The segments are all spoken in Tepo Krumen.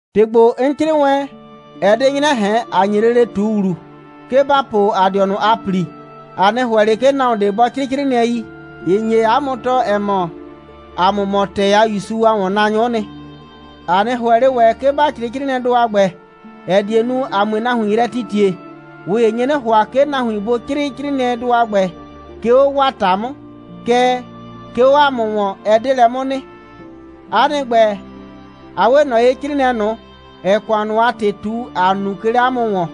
‑Tɩ ‑gbo, 'n 'crɩɩ wɛn, ɛ 'de 'nyrɛ ꞊hɛn, ‑a nye lele ꞊tu ‑wlu, 'ke ‑ba po ‑a dɩɔnʋ a ‑pli. ‑A 'nɩ ‑hʋɛ ꞊le, 'ke nahuon ꞊de bɔ 'crɩɩ 'crɩɩnɩɛi, ‑ɩ nye 'a mʋ tɔɔ, ‑ɛ mɔ, ‑a mʋ mɔ ‑tɛɛ a ‑Yusu a ‑wɔnnaanyʋ'ʋ nɩ. ‑A 'nɩ ‑hʋɛ ꞊le ‑wɛ, 'ke ba 'crɩɩ 'crɩɩnɩɛdʋ a ‑gbɛ, ‑ɛ die nu, ‑a 'mue nahuin yrɛ titie. ꞊Ʋ ‑ye nye 'nɩ ‑hʋa, 'ke nahuin bʋ 'crɩɩ 'crɩɩnɩɛidʋ a ‑gbɛ, 'ke 'o 'waa ‑ta 'mʋ. Kɛɛ, 'ke 'o ‑a mʋ ‑wɔn, ɛ 'de lɛ 'mʋ nɩ. 'A nɩ ‑gbɛ, a 'we ꞊nɔ ye 'crɩɩnɩɛ ꞊nʋ, ‑ɛɛ ‑kʋan ꞊nʋ a ‑tɩ ꞊tu, ‑a nu, 'ke 'le 'a mʋ ‑wɔn.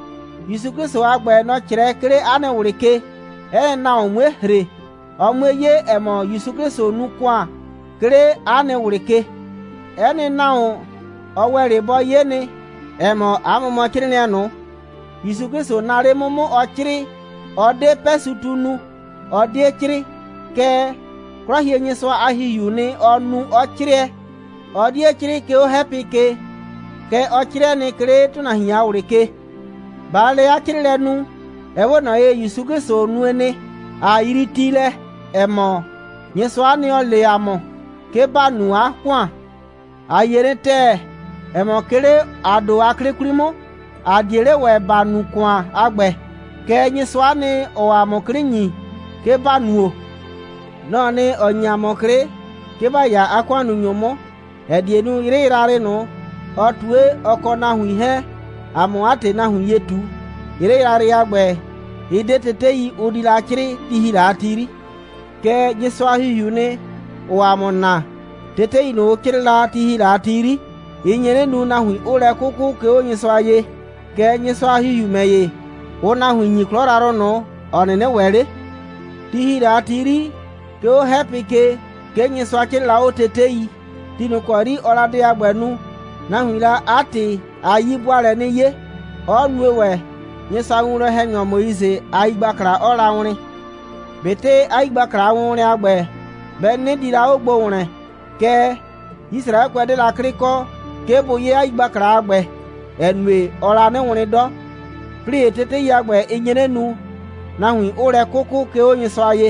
‑Yusu 'Klɩsʋ a ‑gbɛ, nɔ‑ 'crɛɛ, 'ke 'le 'a nɩ ꞊wlɩ ke, 'ɛ nɩ nahuon 'mue ‑hre, ɔ 'mue 'ye, ‑ɛ mɔ, ‑Yusu 'Klɩsʋ nu ‑kʋan, 'ke 'le 'a nɩ ꞊wlɩ ke. 'Ɛ nɩ nahuon, ɔ ‑wɛ 'le bɔ 'ye nɩ, ‑ɛ mɔ, 'a mʋ mɔ 'crɩɩnɩɛ ꞊nʋ, ‑Yusu 'Klɩsʋ naa 'le 'mʋ 'mʋ, ɔ 'crɩɩ. Ɔ 'de 'pɛsɩtu nu, ɔ 'die 'crɩɩ. Kɛɛ, 'Klɔhienyɩsʋa a ‑Hihiuu nɩ, ɔ nu, 'ɔ 'crɛɛ. Ɔ 'die 'crɩɩ, 'ke 'o 'hɛpɩ ke, kɛɛ, ɔ 'crɩɛ nɩ, 'ke 'le ‑tʋnahuin a ꞊wlɩ ke. ꞊Baa lɛ 'a 'crɩɩlɛ nu, ɛ 'we ꞊nɔ ye, ‑Yusu 'Klɩsʋ nue nɩ, ꞊a yrii ti lɛ, ‑ɛ mɔ, Nyɩsʋa'a nɩ, ‑ɔ le ‑a mʋ, 'ke ‑ba nu 'a ‑kʋan. ‑A yie nɩ ‑tɛɛ, ‑ɛ mɔ, 'ke 'le ‑a ‑do a 'klɩ 'kwli 'mʋ, ‑a 'die 'le ‑wɛ ‑ba nu ‑kʋan a ‑gbɛ. Kɛɛ, Nyɩsʋa'a nɩ, ‑ɔɔ ‑a mʋ 'klɩ ‑nyi, 'ke ‑ba nuo. Nɔ‑ɔ nɩ, ‑ɔ ‑nyi ‑a mʋ 'klɩ, 'ke ‑ba 'ya 'a ‑kʋannunyʋ 'mʋ, ‑ɛ die nu, 'yrɩ yrayrɩ ꞊nʋ, ɔ ꞊tue, ɔ kɔ nahuin 'hɛɛn, ‑a 'mʋ 'a ‑tɩ nahuin ye ꞊tu. 'Yrɩ yrayrɩ a ‑gbɛ, ɩ 'de tetei, ʋ 'di la 'crɩɩ, ti ‑hi la a ti 'yri. Kɛɛ, Nyɩsʋa a ‑Hihiuu nɩ, ‑ʋʋ ‑a mʋ naa. Tetei ꞊nʋ, ʋ 'crɩɩ la, ti ‑hi la a ti 'yri, ɩ nye 'nɩ nu, nahuin 'ʋʋ lɛ 'kʋkʋ, 'ke 'o Nyɩsʋa ye. Kɛɛ, Nyɩsʋa a ‑Hihiu ‑mɛ ‑ye, ʋʋ nahuin ‑nyi 'klɔ yrayrʋ ꞊nʋ, ‑ɔ 'nɩnɩ ‑wɛ 'le. Ti ‑hi la a ti 'yri, 'ke 'o 'hɛpɩ ke, 'ke Nyɩsʋa 'crɩɩ la 'o tetei. Ti ꞊nʋ ‑kɔ 'yri ɔɔ la dɛ a ‑gbɛ nu, nahuiin la 'a ‑tɩ a 'yi'bʋaalɛ 'nɩ 'ye, 'ɔ nue ‑wɛ, Nyɩsʋa a winwlɔn‑hɛnyɔ Moise a yigbakla 'ɔɔ la wlɩn. ꞊Betɩ 'a yigbakla a wʋnwlɛn a ‑gbɛ, bɛ 'nɩnɩ di la 'o gbo ‑wlɛn, kɛɛ, Yisraɛkʋɛ 'de la 'klɩ kɔ, 'ke bʋ 'ye 'a yigbakla a ‑gbɛ, ‑ɛ nue, ɔɔ la 'nɩ wlɩn 'dɔ. 'Plɩɩ ‑ye, tetei a ‑gbɛ, ɩ nye 'nɩ nu, nahuin 'ʋʋ lɛ 'kʋkʋ, 'ke 'o Nyɩsʋa ye.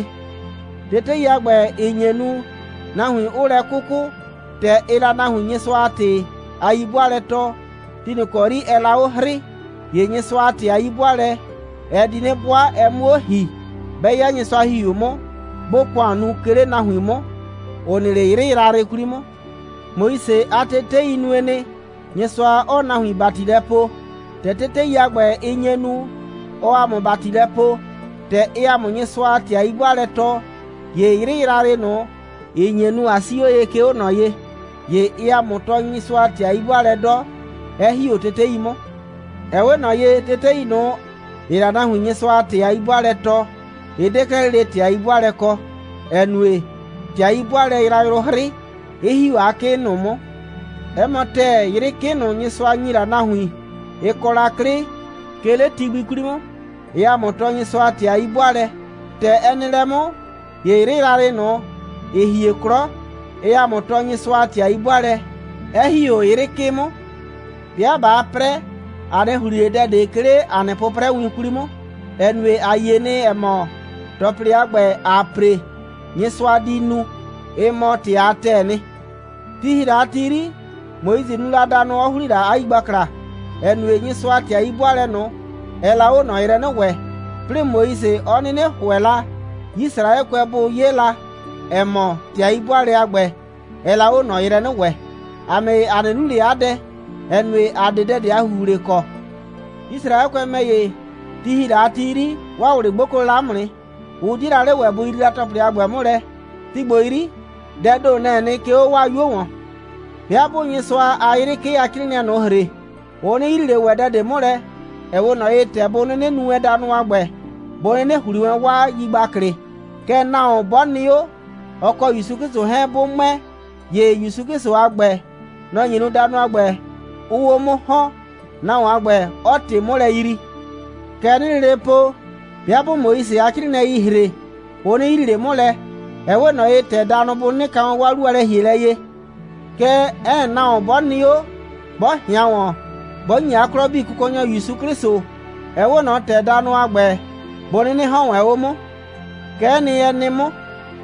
Tetei a ‑gbɛ, ‑ɩ nye nu, nahuin 'ʋʋ lɛ 'kʋkʋ, ‑tɛ ɩɩ la nahuin Nyɩsʋa a ‑tɩ a 'yi'bʋaalɛ tɔɔ, ti ꞊nʋ ‑kɔ 'yri ɛɛ la 'o 'hrɩɩ, ‑ye Nyɩsʋa a ‑tɩ a 'yi'bʋaalɛ, ɛ di 'nɩ 'bʋa, ɛ 'mʋ 'o ‑hi, 'bɛ 'ya Nyɩsʋa a ‑Hihiu 'mʋ, 'bʋʋ ‑kʋan nu, 'ke 'le nahuin ꞊nʋ 'mʋ, ‑ʋ nɩ 'le 'yrɩ yrayrɩ 'kwli 'mʋ. Moise a tetei nue nɩ, Nyɩsʋa 'ɔɔ nahuin ‑bati lɛ poo. ‑Tɛ tetei a ‑gbɛ, ‑ɩ nye nu, 'ɔɔ ‑a mʋ ‑bati lɛ poo, ‑tɛ ɩɩ ‑a mʋ Nyɩsʋa a ‑tɩ a 'yi'bʋaalɛ tɔɔ, ‑ye 'yrɩ yrayrɩ ꞊nʋ, ‑ɩ nye nu, ꞊a 'sii 'o ye, 'ke 'o ꞊nɔ ye, ‑ye ɩɩ ‑a mʋ tɔɔ Nyɩsʋa a ‑tɩ a 'yi'bʋaalɛ 'dɔ, 'ɛ ‑hi 'o tetei 'mʋ. Ɛ 'we ꞊nɔ ye, tetei ꞊nʋ, ‑ɩɩ la nahuin Nyɩsʋa a ‑tɩ a 'yi'bʋaalɛ tɔɔ, ɩ 'de 'klɛɛ lele ‑tɩ a 'yi'bʋaalɛ kɔ, ‑ɛ nue, ‑tɩ a 'yi'bʋaalɛ yrayrʋ 'hrɩ, 'ɩ ‑hi 'o 'a 'kɩ ꞊nʋ 'mʋ. 'Ɛ mɔ ‑tɛɛ, 'yrɩ 'kɩ ꞊nʋ, Nyɩsʋa ‑nyi la nahuin, ‑ɩ kɔ la 'klɩ, 'ke 'le ti gbi 'kwli 'mʋ, ɩɩ ‑a mʋ tɔɔ Nyɩsʋa a ‑tɩ a 'yi'bʋaalɛ. ‑Tɛ ɛ nɩ lɛ 'mʋ, ‑ye 'yrɩ yrayrɩ ꞊nʋ, ‑ɩ hie 'klɔ, ɩɩ ‑a mʋ tɔɔ Nyɩsʋa a ‑tɩ a 'yi'bʋaalɛ, 'ɛ ‑hi 'o 'yrɩ 'kɩ 'mʋ. 'Bɩa ꞊baa 'prɛ, ‑a 'nɩ ‑hli ꞊le dɛ ꞊de, 'ke 'le ‑a nɩ 'pʋprɛwin 'kwli 'mʋ, ‑ɛ nue, ‑a yie nɩ, ‑ɛ mɔ, ‑tɔplɩ a ‑gbɛ, ‑aa ‑pre, Nyɩsʋa di nu, ɩ mɔ ‑tɩ a ‑tɛɛ nɩ. Ti ‑hi la a ti 'yri, Moise nu la danʋ, 'ɔ ‑hli la 'a yigbakla, ‑ɛ nue, Nyɩsʋa a ‑tɩ a 'yi'bʋaalɛ ꞊nʋ, ɛɛ la 'o ꞊nɔ yrɛ 'nɩ wɛ, 'plɩɩ Moise 'ɔ 'nɩnɩ ‑hʋɛ la, Yisraɛkʋɛ bʋ 'ye la, ‑ɛ mɔ, ‑tɩ a 'yi'bʋaalɛ a ‑gbɛ, ɛɛ la 'o ꞊nɔ yrɛ 'nɩ wɛ. ‑A ‑mɛ ‑ye, ‑a 'nɩ nu ꞊le 'a dɛ, ‑ɛ nue, ‑a 'de dɛ ꞊de a ‑huhle kɔ. Yisraɛkʋɛ ‑mɛ ‑ye, ti ‑hi la a ti 'yri, 'waa ꞊wlɩ 'gboklo la 'mʋ nɩ, 'ʋ 'die la 'le ‑wɛ bʋ yrii la ‑tɔplɩ a ‑gbɛ 'mʋ lɛ. Ti ‑gbo 'yri, dɛɛ ‑do, nɛ‑ɛ nɩ, 'ke 'o 'waa 'yuo ‑wɔn. 'Bɩa 'bʋʋ Nyɩsʋa a 'yrɩ 'kɩ a 'crɩɩnɩɛi ꞊nʋ ‑hre, ʋ 'nɩ yrii ꞊le ‑wɛ dɛ ꞊de 'mʋ lɛ. Ɛ 'we ꞊nɔ ye, ‑tɛ bʋ 'nɩnɩ nu wɛn danʋdʋ a ‑gbɛ, bʋ 'nɩnɩ ‑hli wɛn 'waa yigbaklɩ. Kɛɛ, nahuon 'bɔ nɩ 'o, ɔ kɔ ‑Yusu 'Klɩsʋ 'hɛɛn, 'bʋ ‑mʋɛ, ‑ye ‑Yusu 'Klɩsʋ a ‑gbɛ, nɔ‑ nye nu, danʋ a ‑gbɛ 'ʋʋ 'o 'mʋ ‑hɔn, nahuon a ‑gbɛ 'ɔɔ ‑tɩ 'mʋ lɛ yrii. Kɛ 'nɩɩ lele po, 'bɩa 'bʋʋ Moise a 'crɩɩnɩɛi ‑hre, ʋ 'nɩ yrii ꞊le 'mʋ lɛ. Ɛ 'we ꞊nɔ ye, ‑tɛ danʋ bʋ 'nɩnɩ ka wɛn 'waa 'lu a lɛ‑hielɛ ye. Kɛɛ, 'ɛ nɩ nahuon, 'bɔ nɩ 'o, 'bɔ ꞊hɩan ‑wɔn, 'bɔ ‑nyi 'a 'klɔ 'bii Kʋkɔnyɔ ‑Yusu 'Klɩsʋ, ɛ 'we ꞊nɔ ‑tɛ danʋ a ‑gbɛ bʋ 'nɩnɩ ‑hɔn wɛn 'o 'mʋ. Kɛ'ɛ nɩ, ɛ nɩ 'mʋ,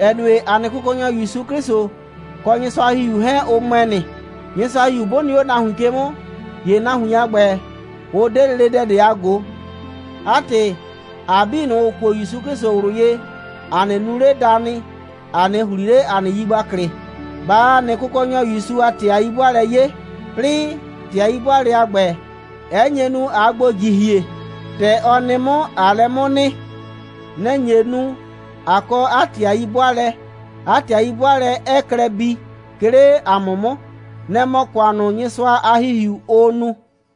‑ɛ nue, ‑a nɩ Kʋkɔnyɔ ‑Yusu 'Klɩsʋ, kɔ Nyɩsʋa a ‑Hihiu 'hɛɛn, ʋ ‑mʋɛ nɩ. Nyɩsʋa a ‑Hihiu 'bʋ nɩ 'o nahuin ke 'mʋ, ‑ye nahuin a ‑gbɛ, ʋ 'de lele dɛ ꞊de a ꞊go. 'A ‑tɩ, ‑a 'bii ꞊nʋ, ‑ʋ kuo ‑Yusu 'Klɩsʋ ꞊wlʋ ye, ‑a 'nɩ nu ꞊le danɩ, ‑a 'nɩ ‑hli ꞊le ‑a nɩ yigbaklɩ, ꞊baa ‑a nɩ Kʋkɔnyɔ ‑Yusu a ‑tɩ a 'yi'bʋaalɛ 'ye, 'plɩɩ, ‑tɩ a 'yi'bʋaalɛ a ‑gbɛ, 'ɛ nye nu, ꞊aa gbo ‑jihie, ‑tɛ ɔ nɩ 'mʋ, ꞊aa lɛ 'mʋ nɩ. Nɛ‑ nye nu, ꞊a kɔ 'a ‑tɩ a 'yi'bʋaalɛ, 'a ‑tɩ a 'yi'bʋaalɛ 'ɛɛ klɛ bii, 'ke 'le ‑a mʋ 'mʋ. Nɛ‑ mɔ ‑kʋan ꞊nʋ, Nyɩsʋa a ‑Hihiu, ʋʋ nu.